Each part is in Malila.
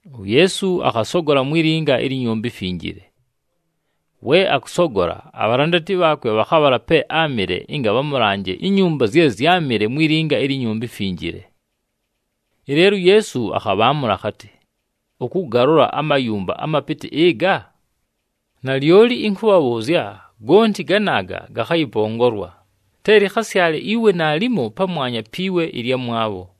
UYeesu akhasogola mwi linga ilyi Nyumba iMfinjile. We akʉsogola, abhalandati bhaakwe bhakhabhala pe áamɨle ɨnga bhamʉlanje inyumba zye zyámɨle mwi linga ilyi Nyumba iMfinjile. Ɨleelo uYeesu akhabhaamʉla akhatɨ, “Ʉkʉgalola amayumba amapɨtɨ ɨga? Nalyoli ɨnkʉbhabhʉʉzya, gonti ganaaga gakhayɨpongolwa, te lɨkhasyale iwe naalimo pamwanya pi we ɨlyamwabho!”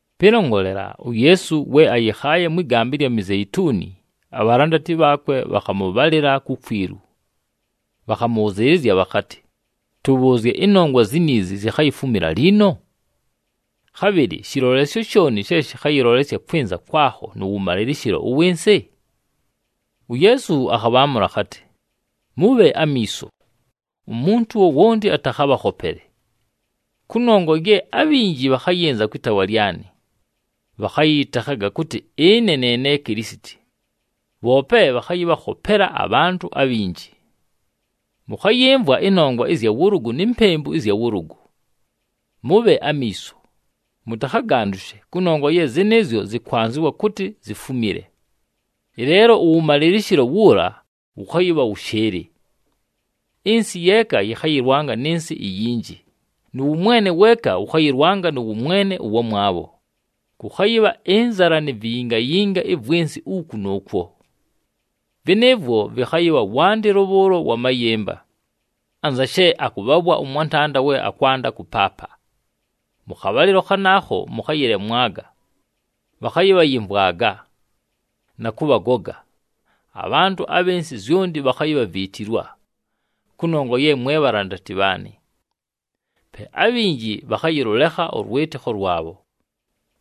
Pɨlongolela, uYeesu we ayɨkhaaye mwɨ gamba ɨlya Mizeituni, abhalandati bhaakwe bhakhamʉbhalɨla kukwilu. Bhakhamʉbhʉzɨɨlɨzya bhakhatɨ, “Tʉbhʉʉzye, ɨnongwa ziniizi zikhayifumila liino? Khabhɨlɨ shɨlolesyo shooni she shɨkhayɨlolesya kwɨnza kwakho nʉ wʉmalɨlɨshɨlo ʉwɨ nsɨ?” UYeesu akhabhaamʉla akhatɨ, “Mʉbhe amiiso, umuntu wowonti atakhabhakhopele! Kʉnongwa ye abhinji bhakhayɨnza kwɨ taawa lyanɨ, bhakhayɨyɨtekhaga kʉtɨ, ‘Ɨne ne ne Kilisiti!’ Bhoope bhakhayɨbhakhopela abhantʉ abhinji. “Mʉkhayɨmvwa ɨnongwa ɨzya wʉlʉgʉ ni mpempu ɨzya wʉlʉgʉ. Mʉbhe amiiso, mʉtakhagandʉshe kʉnongwa ye zɨnɨɨzyo yɨkwanzɨwa kʉtɨ zifumile, ɨleelo ʉwʉmalɨlɨshɨlo wuula wʉkhayɨbha wʉshɨɨlɨ. Ɨnsɨ yeeka yɨkhayɨlwanga nɨ nsɨ iyinji, nʉ wʉmwene weeka wʉkhayɨlwanga nʉ wʉmwene ʉwamwabho. Kʉkhayɨbha ɨnzala ni viyingayinga ɨvwɨ nsɨ, uku nʉʉkwo. Vɨnɨɨvwo vwe vɨkhayɨbha wandɨlo bhʉʉlo wa mayɨmba, anza she akʉbhabhwa ʉmwantanda we akwanda kʉpaapa. Mʉ khabhalɨlo khanaakho, mʉkhayɨlemwaga, bhakhayɨbhayɨmvwaga, na kʉbhagoga, abhantʉ abhɨ nsɨ zyonti bhakhayibhaviitilwa, kʉnongwa ye mwe bhalandati bhaanɨ. Pe abhinji bhakhayɨlʉlekha ʉlwɨtɨkho lwabho.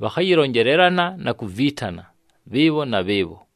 Bhakhayɨlonjelelana na kuviitana bhɨɨbho na bhɨɨbho.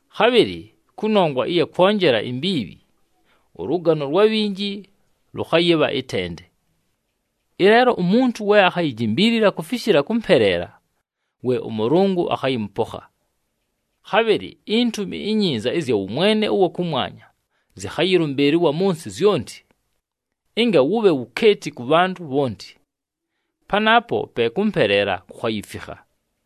Khabhɨlɨ kʉnongwa ɨya kwonjela imbiibhi, ʉlʉgano lwa bhinji lʉkhayɨbha ɨtende. Ɨleelo umuntu we akhayijimbiilila kufishila kʉmpeleela, we ʉMʉlʉngʉ akhayɨmʉpokha. Khabhɨlɨ iNtumi iNyinza ɨzya wʉmwene ʉwa kʉmwanya zɨkhayɨlʉmbɨɨlɨlwa mʉ nsɨ zyonti, ɨnga wʉbhe wukeeti kʉ bhantʉ bhonti. Panaapo pe kʉmpeleela kukhayifikha.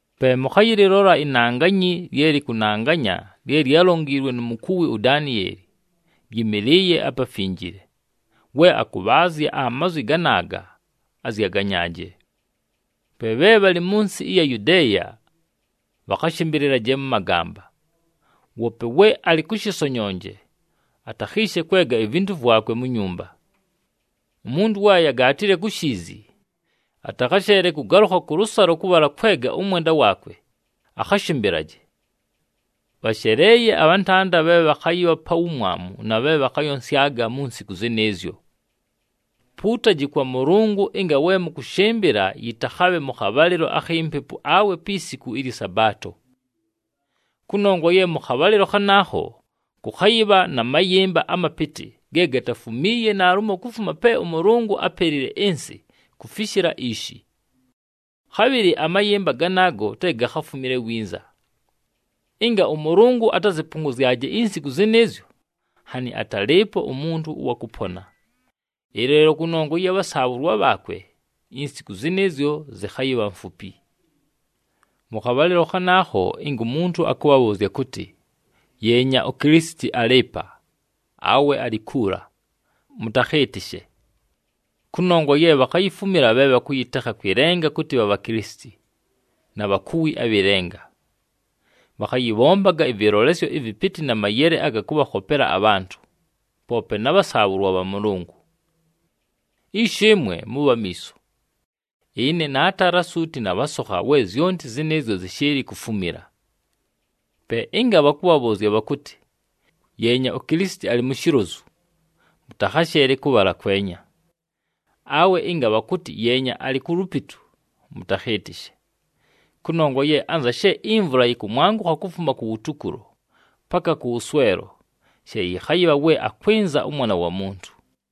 “Pe mʉkhayɨlɨlola ‘inanganyi lye lɨkʉnanganya’ lye lyálonjiilwe nu mukuwi uDanieli, lyɨmɨlɨɨye aPafinjile. We akʉbhaazya amazwi ganaaga, azyaganyaaje. Pe bhe bhalɨ mʉ nsɨ ɨya Yudeeya, bhakhashɨmbɨlɨlaje mʉ magamba. Woope we alɨ kʉ shɨsonyonje, atakhiishe kwega ivintu vwakwe mu nyumba. Umuntu we ayagaatile ku shiizi atakhasheele kʉgalʉkha kʉlʉsalo kʉbhala kwega ʉmwenda waakwe, akhashɨmbɨlaje! Bhasheleeye abhantanda bhe bhakhayɨbha pa wumwamu na bhe bhakhayonsyaga mu nsiku zɨnɨɨzyo! Puutaji kwa Mʉlʉngʉ ɨnga we mʉkʉshɨmbɨla yɨtakhabhe mʉ khabhalɨlo akhi mpepu awe pi siku ɨlyɨ Sabaato. Kʉnongwa ye mʉ khabhalɨlo khanaakho, kʉkhayɨbha na mayɨmba amapɨtɨ ge gatafumiiye naalumo kufuma pe ʉMʉlʉngʉ ápelile ɨnsɨ kufishila ishi. Khabhɨlɨ amayɨmba ganaago te gakhafumile winza. Ɨnga ʉMʉlʉngʉ atazɨpʉngʉzyaje insiku zɨnɨɨzyo, nhanɨ atalɨɨpo umuntu ʉwa kʉpona. Ɨleelo kʉnongwa ɨya bhasaabhʉlwa bhaakwe, insiku zɨnɨɨzyo zɨkhayɨbha mfupi. “Mʉ khabhalɨlo khanaakho, ɨnga umuntu akʉbhabhʉʉzya kʉtɨ, ‘Yeenya, uKilisiti alɨ ɨpa,’ awe ‘Alɨ kuula!’ Mʉtakhɨɨtɨshe. Kʉnongwa ye bhakhayifumila bhe bhakʉyɨtekha kwɨ lenga kʉtɨ bhabha Kilisiti, na bhakuwi abhɨ lenga. Bhakhayɨbhombaga ɨvɨlolesyo ɨvɨpɨtɨ na mayele aga kʉbhakhopela abhantʉ, poope na bhasaabhʉlwa bha Mʉlʉngʉ. Ishi ɨmwe, mʉbhe amiiso! Ɨne naatala suuti nabhasokha we zyonti zɨnɨɨzyo zɨshɨɨlɨ kufumila. Pe ɨnga bhakʉbhabhʉʉzya bhakʉtɨ, ‘Yeenya, uKilisiti alɨ mu shilozu,’ mʉtakhasheele kʉbhala kwenya. Awe ɨnga bhakʉtɨ, ‘Yeenya, alɨ ku lupitu,’ mʉtakhɨɨtɨshe. Kʉnongwa ye anza she imvula yɨkʉmwangʉkha kufuma kuwutukulo paka kʉwʉswelo, she yɨkhayɨbha we akwɨnza ʉMwana wa Muntu.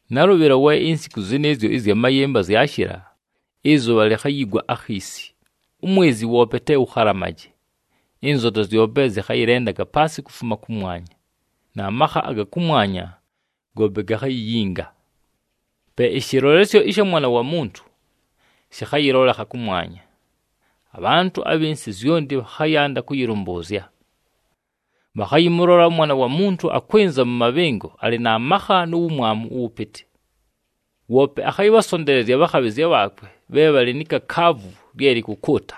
“Nalʉbhɨlo we insiku zɨnɨɨzyo ɨzya mayɨmba zyashɨla, ‘Ɨzʉbha likhayigwa akhiisi, umwezi woope te wʉkhalamaje, ɨnzota zyope zɨkhayɨlendaga paasɨ kufuma kʉmwanya, na makha aga kʉmwanya goope gakhayiyinga.’ “Pe ɨshɨlolesyo ɨsha Mwana wa Muntu shɨkhayɨlolekha kʉmwanya. Abhantʉ abhɨ nsɨ zyonti bhakhayanda kʉyɨlʉmbʉʉzya. Bhakhayɨmʉlola ʉMwana wa Muntu akwɨnza mʉ mabhɨngo alɨ na makha nu wumwamu ʉwʉpɨtɨ. Woope akhayɨbhasonteelezya abhakhabhɨzya bhaakwe bhe bhalɨ ni kakaavu lye lɨkʉkʉʉta,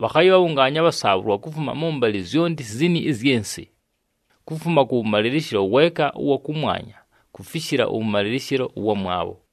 bhakhayɨbhabhʉngaanya abhasaabhʉlwa kufuma mʉmbalɨ zyonti zini ɨzyɨ nsɨ, kufuma kʉwʉmalɨlɨshɨlo weeka ʉwa kʉmwanya kufishila ʉwʉmalɨlɨshɨlo ʉwamwabho.”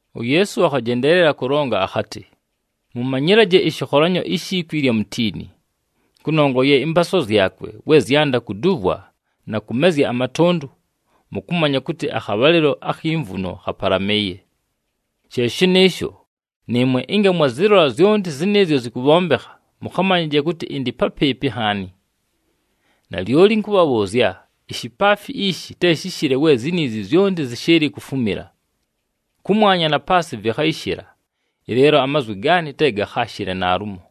UYeesu akhajendeelela kʉlonga akhatɨ, “Mʉmanyɨlaje ɨshɨkholanyo ishi kwi ɨlya mutiini. Kʉnongwa ye ɨmpaaswa zyakwe we zyanda kuduvwa na kʉmezya amatʉndʉ, mʉkʉmanya kʉtɨ akhabhalɨlo akhi mvuno khapalamɨɨye. She shɨnɨɨsho, nɨɨmwe ɨnga mwazɨlola zyonti zɨnɨɨzyo zɨkʉbhombekha, mʉkhamanyaje kʉtɨ ɨndɨ papɨɨpɨ nhaani. Nalyoli ɨnkʉbhabhʉʉzya, ishipaafi ishi te shɨshɨle we ziniizi zyonti zɨshɨɨlɨ kufumila. Kʉmwanya na paasɨ vɨkhayɨshɨla, ɨleelo amazwi gaanɨ te gakhaashɨle naalumo.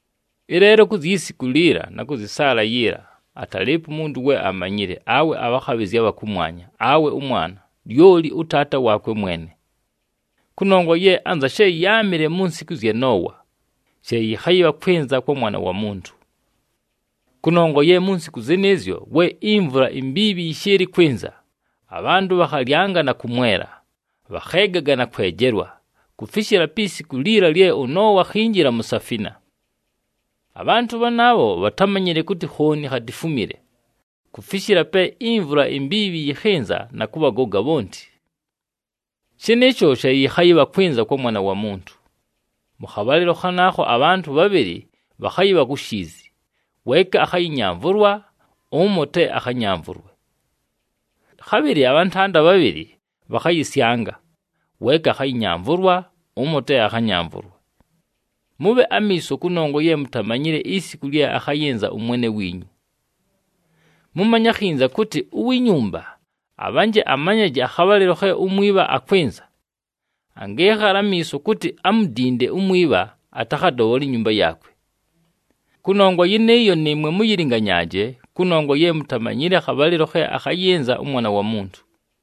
“Ɨleelo ku zyi siku liila na kʉ zyɨ saala yiila, atalɨɨpo umuntu we amanyile awe abhakhabhɨzya abha kʉmwanya, awe ʉMwana, lyoli ʉTaata waakwe mwene. Kʉnongwa ye anza she yáamɨle mu nsiku ɨzya Noowa, she yɨkhayɨbha kwɨnza kwa Mwana wa Muntu. Kʉnongwa ye mu nsiku zɨnɨɨzyo we imvula imbiibhi yɨshɨɨlɨ kwɨnza, abhantʉ bhakhalyanga na kʉmwela, bhakheegaga na kwejelwa, kufishila pi siku liila lye ʉNoowa akhinjila mu safina. Abhantʉ bhanaabho bhatámanyile kʉtɨ khooni khatifumile kufishila pe imvula imbiibhi yɨkhɨnza na kʉbhagoga bhonti. Shɨnɨɨsho she yɨkhayɨbha kwɨnza kwa Mwana wa Muntu. Mʉ khabhalɨlo khanaakho abhantʉ bhabhɨlɨ bhakhayɨbha ku shiizi, weeka akhayɨnyamvʉlwa, ʉmo te akhanyamvʉlwe. Khabhɨlɨ abhantanda bhabhɨlɨ bhakhayɨsyanga, weeka akhayɨnyamvʉlwa, ʉmo te akhanyamvʉlwe. Mʉbhe amiiso kʉnongwa ye mutamanyile isiku lye akhayɨnza ʉMwene wiinyu. Mʉmanye akhinza kʉtɨ, uwi nyumba abhanje amanyaje akhabhalɨlo khe umwibha akwɨnza, angɨɨkhala amiiso kʉtɨ amudinde umwibha atakhadobhole inyumba yaakwe. Kʉnongwa yɨnɨɨyo, nɨɨmwe mʉyɨlɨnganyaaje kʉnongwa ye mutamanyile akhabhalɨlo khe akhayɨnza ʉMwana wa Muntu.”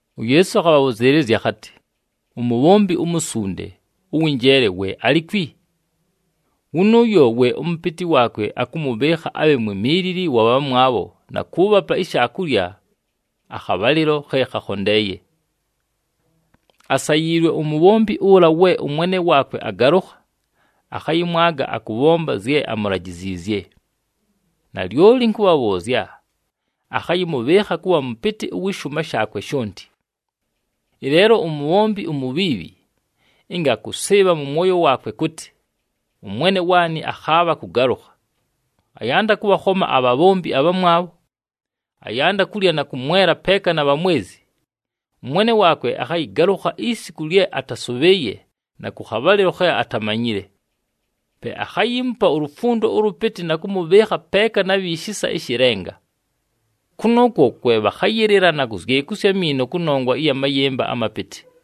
UYeesu akhabhʉzɨɨlɨzya akhatɨ, “Umubhombi umusunde, ʉwɨ njeele, we alikwi? Wʉnʉʉyo we ʉmʉpɨtɨ waakwe akʉmʉbhɨɨkha abhe mwimiilili wa bhamwabho na kʉʉbhapa ishaakulya akhabhalɨlo khe khakhondeeye. Asayiilwe umubhombi ʉla we ʉmwene waakwe agalʉkha, akhayɨmwaga akʉbhomba zye amulajiziizye. Nalyoli ɨnkʉbhabhʉʉzya, akhayɨmʉbhɨɨkha kʉbha mʉpɨtɨ wɨ shʉʉma shaakwe shonti. Ɨleelo umubhombi umubhiibhi, ɨnga akʉsɨɨbha mʉ mwoyo waakwe kʉtɨ, ‘Ʉmwene waanɨ akhaabha kʉgalʉkha,’ ayanda kʉbhakhoma abhabhombi abhamwabho, ayanda kulya na kʉmwela peeka na bhamwezi, ʉmwene waakwe akhayɨgalʉkha isiku lye atasʉbhɨɨye na khabhalɨlo khe atamanyile. Pe akhayiimupa ulufundo ʉlʉpɨtɨ na kʉmʉbhɨɨkha peeka na bhi shisa ɨshɨ lenga. Kʉnʉʉkwo kwe bhakhayɨlɨla na kuzyekusya amiino kʉnongwa ya mayɨmba amapɨtɨ.”